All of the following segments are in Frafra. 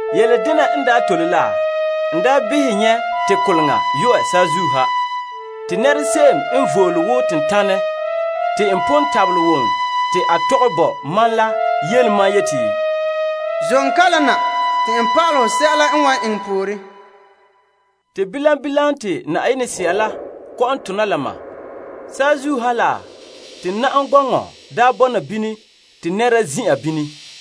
Yele dena n tole la, n daa behɛ mɛ nyɛ' te koleŋa yu'ɛ saazuo ha. Te nɛra se'em n vole wo tentanɛ, te n pon wom te a tɔgɛ bo mam yeti, Zom kalam na te n pa'alɛ hɔ sɛla n wan eŋɛ pooren. Te bilam bilam te Yenɛ Sea la kɔ'ɔn tona la ma. Saazuo ha la, te na'am gɔŋɔ bɔna bini te nɛra zin'an bini.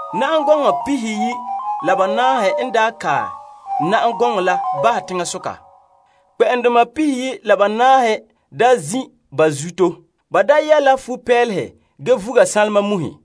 Na'am gɔnɔ pihiyi' la banaahe n kae na'am gɔŋɔ la bahɛ teŋasoka. Kpɛ'ɛndoma pihiyi' la banaahe daa zin' ba zuto. Ba daa yɛ' la futo n ane fa'a ge vuga sanlema muhe.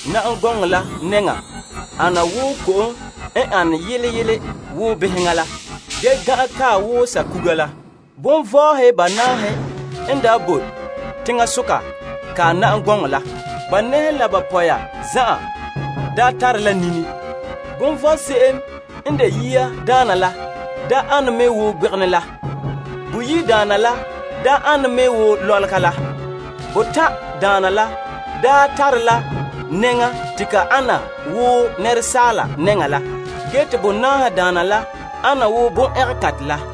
Na'am gɔŋɔ la nɛŋan sɛla gan' ana wo ko'kantɛ nyagera wo beheŋa la. Bondoma banaahe n bo teŋasoka kae na'am gɔŋɔ la. Ba nɛhe la ba pɔya zan'an daa tare la nini. Bondoma la se'em n de yiadaana la ane me wo gbegenɛ la. Boyi' daana la ane me wo lɔlega la. Batan' daana la tare la nɛŋa te ka ana wo asaala nɛŋa la. Gee te bonaahe daana la ana wo tuguho la.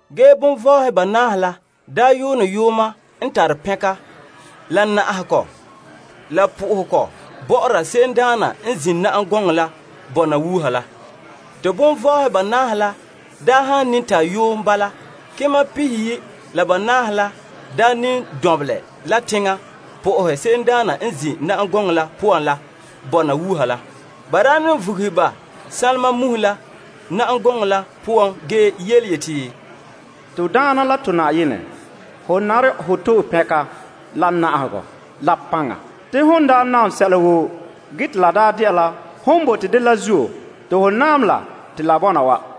Ge kelompagehedoma banaahe la yuune yuuma n tare pɛnka, la na'ahegɔ, la po'ohegɔ bɔ'ɔra se'emdaana n zin' na'am gɔŋɔ la bɔna wuuha la. Te kelompagehedoma banaahe la han ne ta yuun bala, kema pihiyi' la banaahe la ne lu la teŋa na'ahe se'emdaana n zin' na'am gɔŋɔ la poan la bɔna wuuha la. Ba ne vuguhe ba sanlema muhe la mɛ lobe bahɛ na'am gɔŋɔ la nɛŋan ge yeti, To Na'ayenɛ la to Yenɛ, ho nare hɔ to'e pɛnka, la na'ahegɔ, la paŋa. Se'ere n sɔe la hon naam sɛla woo. La dela hon sunboolom la zuo te ba bɔna wa.